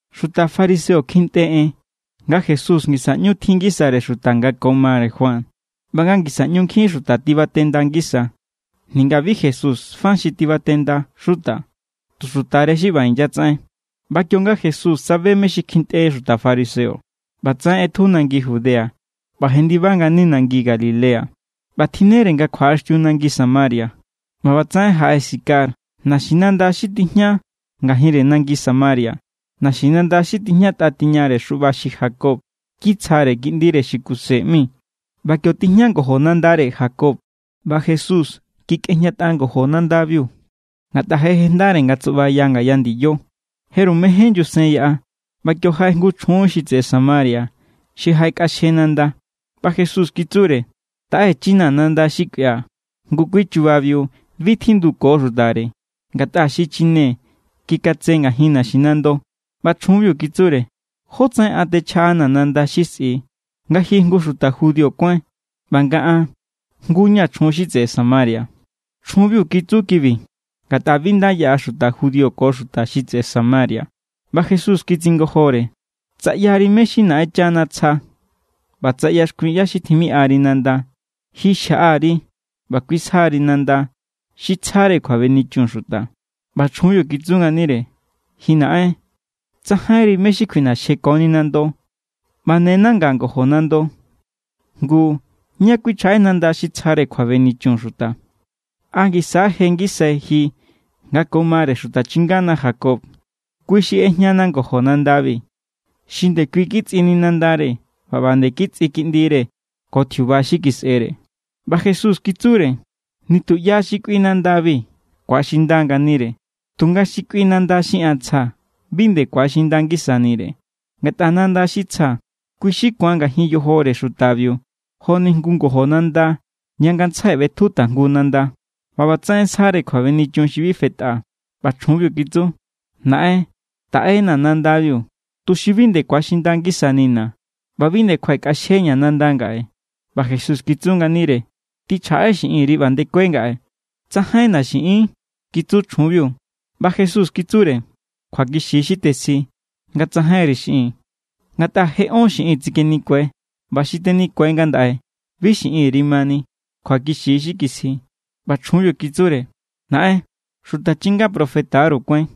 Xuta fariseo kjintꞌe en nga Jesús ngisa ꞌñu tjin ngisare xuta nga ko mare Juan ꞌba nga ngisa ꞌñu nkjin xuta tibatenda ngisa. (Ninga bi Jesús fa xi tibatenda xuta. Tu xutare xi ꞌba inyatsaꞌen.) ꞌBa kionga Jesús tsabe mé= xi kjintꞌe xuta fariseo, ꞌbatsaꞌen ꞌetju nangi Judea ꞌba jendiba ngani nangi Galilea. ꞌBa tjinnere nga kjuaꞌaxtiu nangi Samaria. ꞌBa ꞌbatsaꞌen jaꞌe Sicar, naxinanda xi tijña ngajinre nangi Samaria, naxinanda xi tijñatꞌa tiñare xuꞌba xi Jacob kitsjare kiꞌndire xi Kuse ꞌmi. ꞌBa kio tijña ngojo nandare Jacob, ꞌba Jesús kikꞌejñatꞌa ngojo nandabiu, ngatꞌa je jejndare nga tsuꞌba ngaya ndiyo. Jeru mején nyusen yaꞌa. ꞌBa kio jaꞌe jngu chjun xi tseꞌe Samaria xi jaꞌekꞌaxje nanda. ꞌBa Jesús kitsure: —Taꞌechinaa̱ nanda xi kꞌuia̱. Ngu kui chubabiu bi tjinduko xutare, ngatꞌa xichine= kikatse ngajin naxinando. ꞌBa chjunbiu kitsure: —¿Jótsaꞌen an techjaꞌanaa̱ nanda xi sꞌi, nga ji jngu xuta judío kuáin ꞌba nga an jngu= ña̱ chjun xi tseꞌe Samaria? Chjunbiu kitsu kibi ngatꞌa bi nda yaꞌa xuta judío ko xuta xi tseꞌe Samaria. ꞌBa Jesús kitsingojore: —Tsa ꞌyari mé= xi Naꞌenchana tsja ꞌba tsa ꞌyaxkuin ꞌyá= xi timiꞌari nanda, ji xjaꞌa_ri ꞌba kui sja=ri nanda xi tsjare kjuabenichun xuta. ꞌBa chjunbiu kitsu nganire: —Ji naꞌen, tsajainri mé= xi kjuiꞌnaxjekoni nando, ꞌba ne nanga ngojo nando. Ngu, ¿ñá kꞌuinchjaꞌe nanda xi tsjare kjuabenichun xuta? ¿A ngisa= je ngisai ji nga ko mare xuta chingana Jacob? Kui xi ꞌejñana ngojo nandabi, xi ndekui kitsꞌini nandare ꞌba ꞌba nde kitsꞌi kiꞌndire ko tjiuba xi kisꞌere. ꞌBa Jesús kitsure: —Nitu ꞌya xi kꞌui nandabi ku̱axinda= nganire. Tunga xi kꞌui nanda xi an tsjaa̱ bi nde ku̱axinda ngisanire. Ngatꞌa nanda xi tsjaa̱, kui= xi ku̱an ngajin yojore xutabiu joni jngu ngojo nanda ña ngantsjai ꞌbetju tajngu nanda, ꞌba ꞌbatsaꞌen sjare kjuabenichun xi bi fetꞌa. ꞌBa chjunbiu kitsu: —Naꞌen, taꞌena nandabiu, tuxi bi nde ku̱axinda ngisanina̱ ꞌba bi nde kjuaꞌekꞌexjeña̱ nanda ngaꞌe. ꞌBa Jesús kitsu nganire: —Tꞌichjaꞌe xiꞌinri ꞌba ndekue ngaꞌe. —Tsajainna̱ xiꞌin —kitsu chjunbiu. ꞌBa Jesús kitsure: —Kjuakixi= xi tesji, nga tsajainri xiꞌin. Ngatꞌa je ón xiꞌin tsikenikue, ꞌba xi tenikue ngandaꞌe bi xiꞌinri mani. Kjuakixi= xi kisji. ꞌBa chjunbiu kitsure: —Naꞌen, xuta chinga profeta=ru kuáin.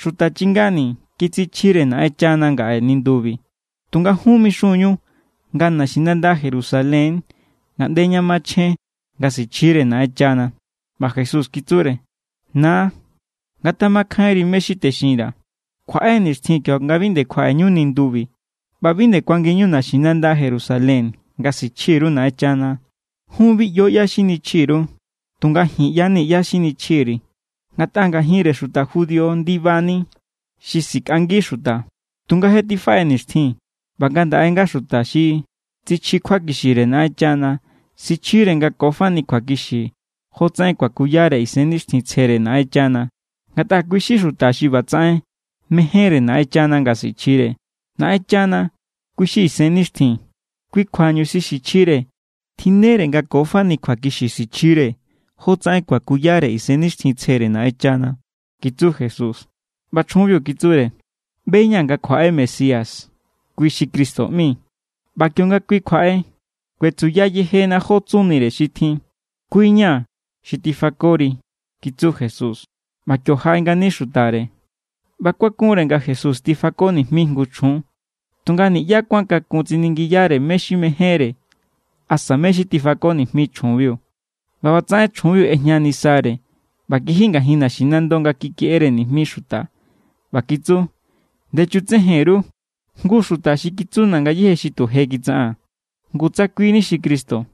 Xuta chingani̱ kitsichjire Naꞌenchana ngaꞌe nindubi. Tunga jun mixun=ñu nga naxinanda Jerusalén= ngaꞌnde ña machjen nga sichjire Naꞌenchana. ꞌBa Jesús kitsure: —Na, ngatjamakjainri mé= xi texinra̱. Kjuaꞌe nixtjin kionga bi nde kjaꞌeñu nindubi ꞌba bi nde kuanginñu naxinanda Jerusalén nga sichji_ru Naꞌenchana. Jun bi ꞌyo ꞌyá= xi nichji_ru. Tunga ji̱n ꞌya=ni ꞌyá= xi nichji_ri̱, ngatꞌa ngajinre xuta judío= ndibani xi sikꞌangi xuta. Tunga je tifaꞌe nixtjin ꞌba ngandaꞌe= nga xuta xi tsichji kjuakixire Naꞌenchana sichjire nga ko fani kjuakixi jotsaꞌen kuakuyare Isennixtjintsjere Naꞌenchana. Ngatꞌa kui= xuta xi ꞌbatsaꞌen mejénre Naꞌenchana nga sichjire. Naꞌenchana, kui= xi Isennixtjin. Kui kjuañu xi sichjire, tjinnere nga ko fani kjuakixi sichjire jotsaꞌen kuakuyare Isennixtjintsjere Naꞌenchana —kitsu Jesús. ꞌBa chjunbiu kitsure: —ꞌBe=ña̱ nga kjuaꞌe Mesías (kui xi Cristo ꞌmi). ꞌBa kionga kui kjuaꞌe, kuetsuya yejena jó tsunire xi tjin. —Kui= ña̱, xi tifakori —kitsu Jesús. ꞌBa kio jaꞌe ngani xutare, ꞌba kuakunre nga Jesús tifako nijmi jngu chjun. Tunga niꞌyá kuán kakun tsiningiyare mé= xi mejénre asa mé= xi tifako nijmi chjunbiu. ꞌBa ꞌbatsaꞌen chjunbiu ꞌejña nisare ꞌba kiji ngajin naxinando nga kikeꞌere nijmi xuta ꞌba kitsu: —Ndechutsejen_ru jngu xuta xi kitsuna̱ ngayéje xi tu je kitsaꞌaa̱n. Ngu tsa kui= ni xi Cristo.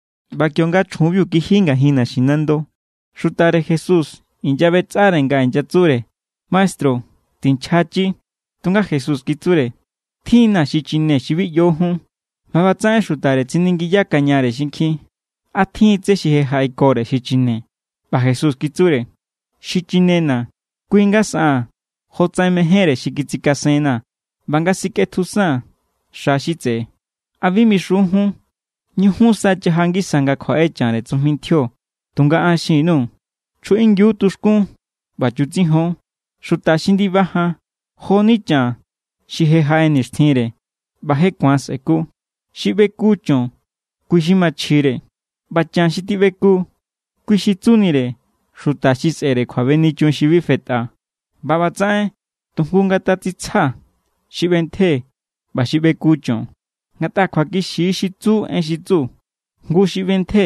ꞌBa kionga chjunbiu kiji ngajin naxinando, xutare Jesús inyaꞌbetsꞌare nga inyatsure: —Maestru, tinchjachi. Tunga Jesús kitsure: —Tjin=na̱ xichine xi bi ꞌyo jun. ꞌBa ꞌbatsaꞌen xutare tsiningiyakañare xinkjin: —¿A tjin= tsé xi jaꞌekore xichine? ꞌBa Jesús kitsure: —Xi chinena̱, kui= nga saꞌaa̱n jotsaꞌen mejénre xi kitsikasenna̱ ꞌba nga sikꞌetjusaa̱n xa xi tseꞌe. ¿A bi mixun jun: “Ñujun sa chaja ngisa nga kjuaꞌe chanre tsujmi ntjio”? Tunga an xin_nuu̱: Chjuꞌingiu tuxkún ꞌba chutsijon. Xuta xi ndiba jan jo=ni chan xi je jaꞌe nixtjinre, ꞌba je ku̱an sꞌe̱ku. Xi ꞌbeku cho̱n, kui= xi machjire. ꞌBa chan xi tiꞌbeku, kui xi tsunire xuta xi sꞌe̱re kjuabenichun xi bi fetꞌa. ꞌBa ꞌbatsaꞌen tujngu ngatatsitsja xi ꞌbentje ꞌba xi ꞌbeku cho̱n. Ngatꞌa kjuakixi= xi tsu en xi tsu: “Jngu xi ꞌbentje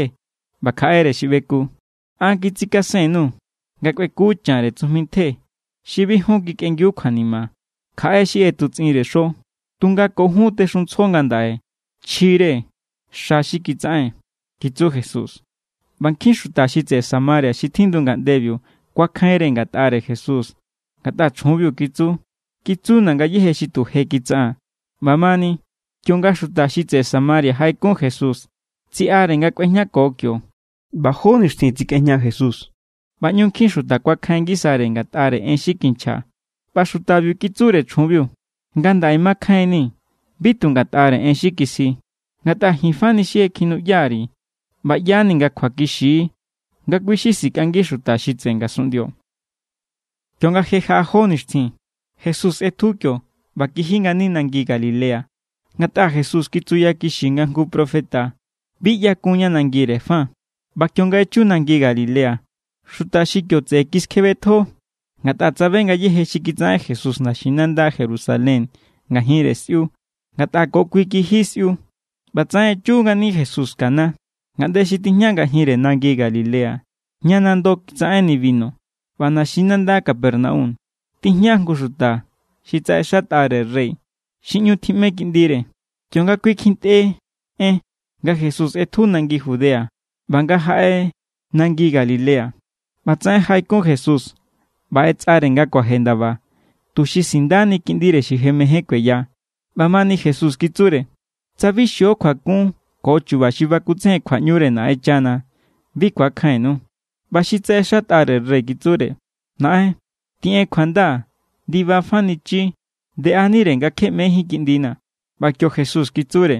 ꞌba kjaꞌere xi ꞌbeku.” An kitsikasen_nuu̱ nga kꞌueku chanre tsujmi ntje xi bi jun kikꞌengiu kjuanima. Kjaꞌe xi ꞌetutsꞌinre xo, tunga ko jun texuntsjo ngandaꞌe chjire xa xi kitsaꞌen —kitsu Jesús. ꞌBa nkjin= xuta xi tseꞌe Samaria xi tjindu ngaꞌndebiu kuakjainre ngatꞌare Jesús, ngatꞌa chjunbiu kitsu: “Kitsuna̱ ngayéje xi tu je kitsaꞌaa̱n.” ꞌBamani, kionga xuta xi tseꞌe Samaria jaꞌekun Jesús, tsiꞌare nga kꞌuejñako kio. ꞌBa jó nixtjin tsekꞌejña Jesús, ꞌba ꞌñu nkjin xuta kuakjain ngisare ngatꞌare en xi kinchja. ꞌBa xutabiu kitsure chjunbiu: —Ngandaꞌe makjainni̱ bi tu ngatꞌare en xi kisji. Ngatꞌa ji̱n fani xi je kjinuꞌya_ri̱ ꞌba ꞌya=ni nga kjuakixi= nga kui= xi sikꞌangi xuta xi tseꞌe ngasunꞌndio. Kionga je jaꞌa jó nixtjin, Jesús ꞌetju kio ꞌba kiji ngani nangi Galilea. Ngatꞌa Jesús kitsuyakixi nga jngu profeta bi ꞌyakun ña nangire fa. ꞌBa kionga echu nangi Galilea, xuta xi kio tseꞌe kiskjebetjo, ngatꞌa tsabe ngayéje xi kitsaꞌen Jesús naxinanda Jerusalén ngajinre sꞌiu. Ngatꞌa ko kui kiji sꞌiu. ꞌBatsaꞌen echu ngani Jesús Caná, ngaꞌnde xi tijña ngajinre nangi Galilea, ña nando kitsaꞌenni binu. ꞌBa naxinanda Capernaum tijña jngu xuta xi tsaꞌexatꞌare rey xi ꞌñu tjiꞌme kiꞌndire. Kionga kui kjintꞌe en nga Jesús ꞌetju nangi Judea ꞌba nga jaꞌe nangi Galilea, ꞌbatsaꞌen jaꞌekun Jesús ꞌba ꞌetsꞌare nga kuaje ndaba, tuxi sindani kiꞌndire xi je mején kueya. ꞌBamani Jesús kitsure: —Tsa bi xio kjuakun ko chuba xi bakutsejen kjuaꞌñure Naꞌenchana, bi ku̱akjainnu. ꞌBa xi tsaꞌexatꞌare rey kitsure: —Naꞌen, tiꞌen kjuanda, ndibafanichi ndeꞌanire nga kje ꞌmejín kiꞌndina̱. ꞌBa kio Jesús kitsure: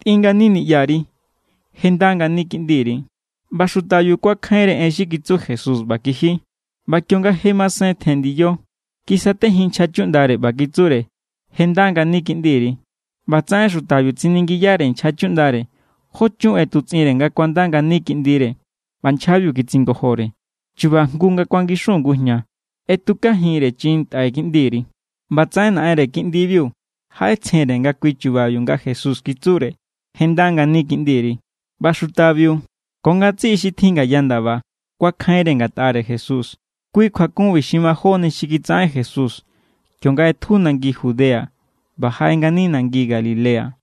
—Tꞌin ngani niꞌyari. Je nda ngani kiꞌndiri. ꞌBa xutabiu kuakjainre en xi kitsu Jesús ꞌba kiji. ꞌBa kionga je masen tjen ndiyo, kisatejin nchja chuꞌndare ꞌba kitsure: —Je nda ngani kiꞌndiri. ꞌBatsaꞌen xutabiu tsiningiyare nchja chuꞌndare jó chun ꞌetutsꞌinre nga kuanda ngani kiꞌndire, ꞌba nchjabiu kitsingojore: —Chuba jngu nga kuangixun ngujña ꞌetjukajinre chiꞌin ntꞌai kiꞌndiri. ꞌBatsaꞌen naꞌenre kiꞌndibiu jaꞌetsjenre nga kui= chubabiu nga Jesús kitsure: “Je nda ngani kiꞌndiri.” ꞌBa xutabiu ko ngatsiꞌi xi tjin ngaya ndaba kuakjainre ngatꞌare Jesús. Kui kjuakunbi xi majóni xi kitsaꞌen Jesús, kionga ꞌetju nangi Judea ꞌba jaꞌe ngani nangi Galilea.